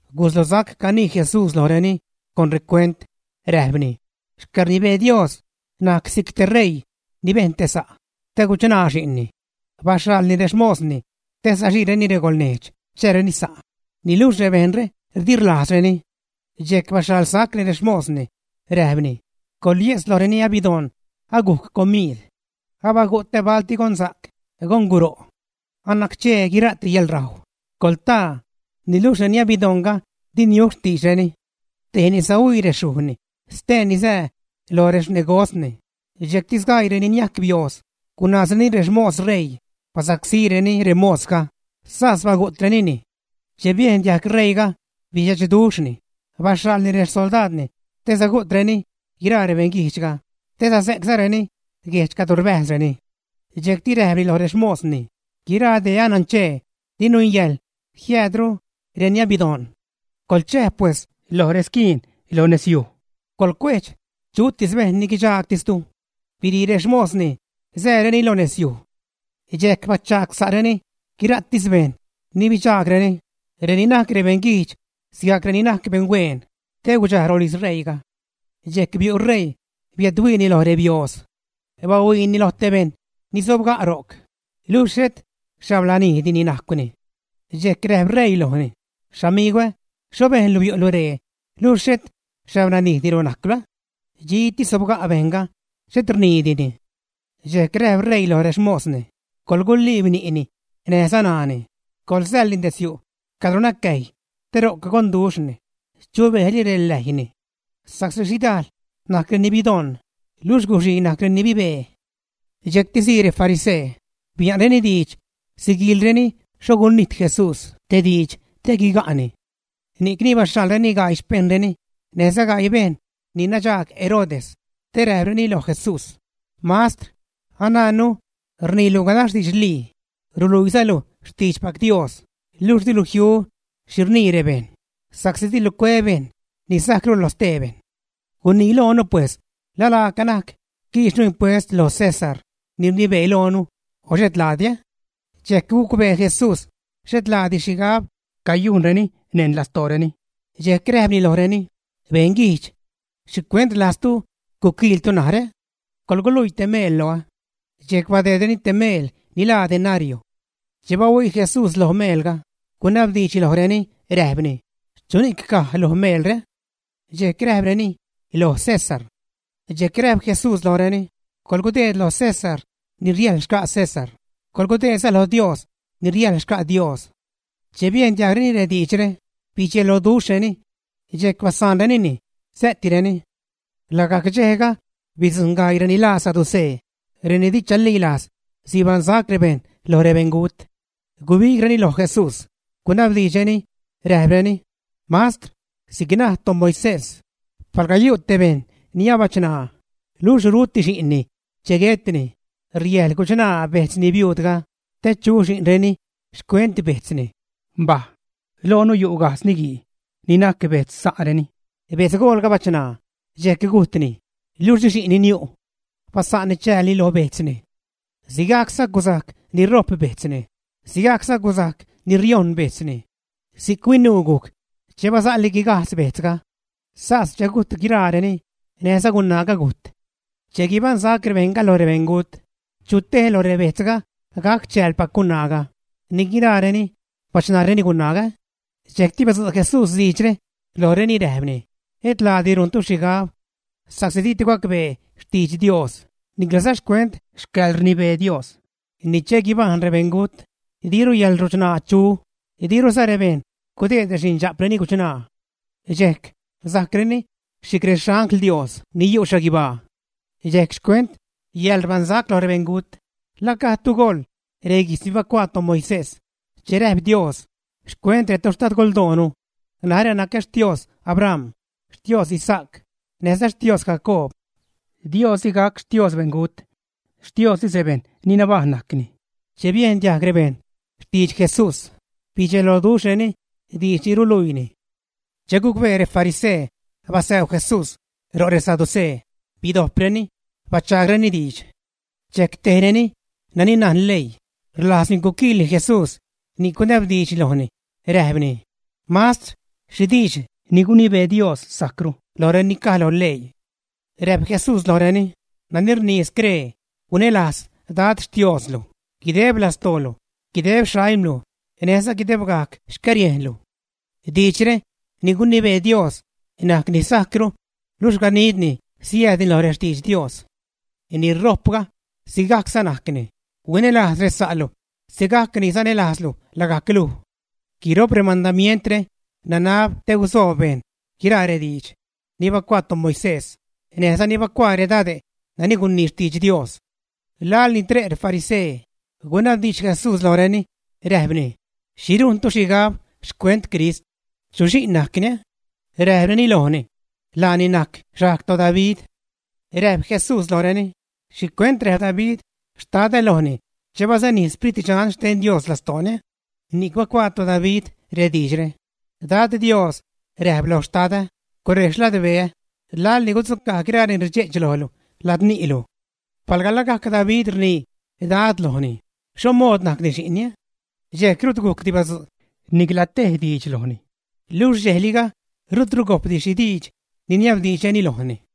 Guslosac canii Jesús lojreni con recuent, räjpni: ―Xcäḻrnibee Dios najc si'c te ṟeii ni bejn te sa' te guchṉaa xi'nni. Baxhaḻni rexmosni te saxiireni regolnejdx chääreni sa', niluxh rebejṉre di rlajzdireni. Dxejc baxhaḻsacni rexmosni, räjpni: “Coḻye'tz loj reni abidoṉ, agujc comiid. ¡Abagutä balti gonsa'c, gonguro'! Anacchee guira'ti yäḻrajw. Coḻtaa.” Niluxh reni abidoṉga di niu xtiidxreni. Tejni sahuii rexyujni, steeni sää lo rexnegosni, dxejcti sgaii reni niajc biooz gunaazreni rexmos ṟeii, basacsíreni remosga, sas bagu'trenini. Che biejn diajg ṟeiiga, bidxe'chduxhni, baxhaḻni rexsoldaadni te sagu'treni guiraa rebeṉguijdxga, te saze'czareni guejdx cadro rbäjzreni. Dxejcti räjpni loj rexmosni: “Guiraa dee anacchee, di nungäjḻ jiäädru reni abidoṉ. Coḻchäj, pues, lo resquiin lo nezyuj, coḻcuejdx chutis bejṉ ni guidxaagtistu.” Birii rexmosni, sääreni lo nezyuj. Dxejc bachagsa'reni guiraatis bejṉ ni bidxaagreni, reni najc beṉguijdx sigajc reni najc beṉhueen te gudxaj rolijz ṟeiiga. ’Dxejc biu' ṟeii biädhuiini loj rebiooz. Bahuiini loj te bejṉ ni sobga' ro'c, luxh xhet xhablanijdini najcwni. Dxejc räjp ṟeii lojni: “Xamigwä, ¿xho bejnlu biu'lu ree luxh xhet xhablanijdilu najcwlu?” Dxitis sobga' bejṉga, xhet rniidini. Dxejc räjp ṟeii loj rexmosni: “Coḻguliib ni'ni näjza ṉaani, coḻsäḻni detzyu' cadro nacäjy te ro'c gonduxhni chubejli reläjyni.” Sa'csi xhidajl najc reni bidoṉ luxh guxii najc reni bibee. Dxejcti sii refarisee, bia'nreni diidx siguiilreni xho gunijt Jesús te diidx te guiga'ni. Ni'c baxhaḻreni gaii xpejṉreni näjza gaii bejṉ ni nadxaag Herodes te räjpreni loj Jesús: ―Mastr, anajnnu rniilu ganax didxlii, ruluiizalu xtiidxpac Dios, luxh dilu jiu xhi rnii rebejṉ, sa'csi dilu cue bejṉ ni sajcru lo stee bejṉ. Gunii loonu, pues: ¿La laaca najc quiixnu impuest lo César ni rnibee loonu o et laadi? Dxejc gucbee Jesús xhet laadi xhigab cayujnreni neṉ lastooreni, dxejc räjpni lojreni: ―¡Beṉguijdx! ¿Xhicuent rlajztu guquiiltu narä? Coḻguluii te meel loä. Dxejc badeedreni te meel ni laa denario. Che bahuii Jesús loj meelga, gunabdiidxni lojreni, räjpni: ―¿Chuni'c caj lo meelre? Dxejc räjpreni: ―Loj César. Dxejc räjp Jesús lojreni: ―Coḻgudeed lo César ni riäjl xca' César, coḻgudeedza lo Dios ni riäjl xca' Dios. Che biejn diajgreni rediidxre, bidxeloduxhreni. Dxejc basaanrenini, sä'tireni. Lagajc dxejga bidzujṉ gaii reni laa saducee, reni di chalilajz sibaṉsac bejṉ loj rebeṉgut. Gubigreni loj Jesús, gunabdiidxreni, räjpreni: ―Mastr, si'c naj toMoisés, palga yu' te bejṉ ni abachṉaa, luxh ruti xi'nni che guetni, riäjḻ guchṉaa bejtzni biuudga te chu xi'nreni xcuent bejtzni. Mbaj. Loonu yu' gajdz niguii ni najc bejtz sa'reni. Betzgoolga bachṉaa, dxejc gujtni, luxh di xi'nni niu'. Basa'nni chäälni lo bejtzni. Sigajcza gusajc ni ṟo'p bejtzni; sigajcza gusajc ni riojṉ bejtzni. Si'c huinuu gujc che basa'li guigajdz bejtzga. Sas che gujt guiraareni, näjza gunaaga gujt. Che guibaṉsac rebejṉga lo rebeṉgut, ¿chu tej lo rebejtzga gac chäälpac gunaaga, ni guiraareni bachṉaareni gunaaga? Dxejcti badzu' Jesús diidxre lojreni, räjpni: ―Et laadi rujntu xhigab sa'csi ditu gacbee xtidx Dios niclaza xcuent xcäḻrnibee Dios. Ni che guibajṉ rebeṉgut, diru yäḻruchṉaa chu, diruza bejṉ gudeed rexindxa'preni guchṉaa. Dxejc sajcreni si'c rexangl Dios ni yu' xhaguibaa. Dxejc xcuent yäḻrbaṉsac loj rebeṉgut, ¿la gajdtu goḻ reguijtz ni bacuaa toMoisés che räjp Dios xcuent retoxtadgoldoonu: “Narä nacä Xtios Abram, Xtios Isaac, näjza Xtios Jacoob”, ä? Dios di gac Xtios beṉgut, Xtiostis rebejṉ ni nabajṉ najcni. Che biejn diajg rebejṉ xtidx Jesús, bidxeloduxhreni diidx ni ruluiini. Che gucbee refarisee basäu Jesús ro' resaducee, bidojpreni, bachaagreni diidx. Dxejc tejreni nani najn leii, rlajzni guquiilni Jesús ni'c gunabdiidxni lojni räjpni: ―Mastr, ¿xhi diidx ni gunibee Dios sajcru lojreni caj lo leii? Räjp Jesús lojreni: ―Nani rnii scree: “Huinälajz Dad Xtioslu guideb lastoolu, guideb xaimlu, näjza guidebgajc xcäriejnlu.” Diidxre ni gunibee Dios najc ni sajcru, luxh ganidni siäädni loj rextidx Dios. Ni ṟo'pga sigajcza najcni: “Huinälajz resa'lu sigajc ni sanälajzlu lagajc luj.” Guiro'p remandamientre nanab te guzoob bejṉ guiraa rediidx ni bacuaa toMoisés näjza ni bacuaa redade' nani gunii xtidx Dios. Laḻni tre' refarisee, gunabdiidx Jesús lojreni, räjpni: ―¿Xhi rujntu xhigab xcuent Crist? ¿Chu xi'n najcni? Räjpreni lojni: ―Laani najc xajg toDavid. Räjp Jesús lojreni: ―¿Xhicuent räjp David “Xtadä” lojni che basanij Sprit Dxan xten Dios lastooni? Ni'c bacuaa toDavid rediidxre: Dad Dios räjp lo Xtadä, gurej xladbeä laḻ ni gudzugä guiraa reni rdxe'ch lojlu ladzni'lu. Palga lagajc David rnii: “Dad” lojni, ¿xho mood najcni xi'nni? Dxejc rut gujcdi badzu' nicla te diidx lojni, luxh dxejliga rutru gojpdi xhi diidx niniabdiidxrureni lojni.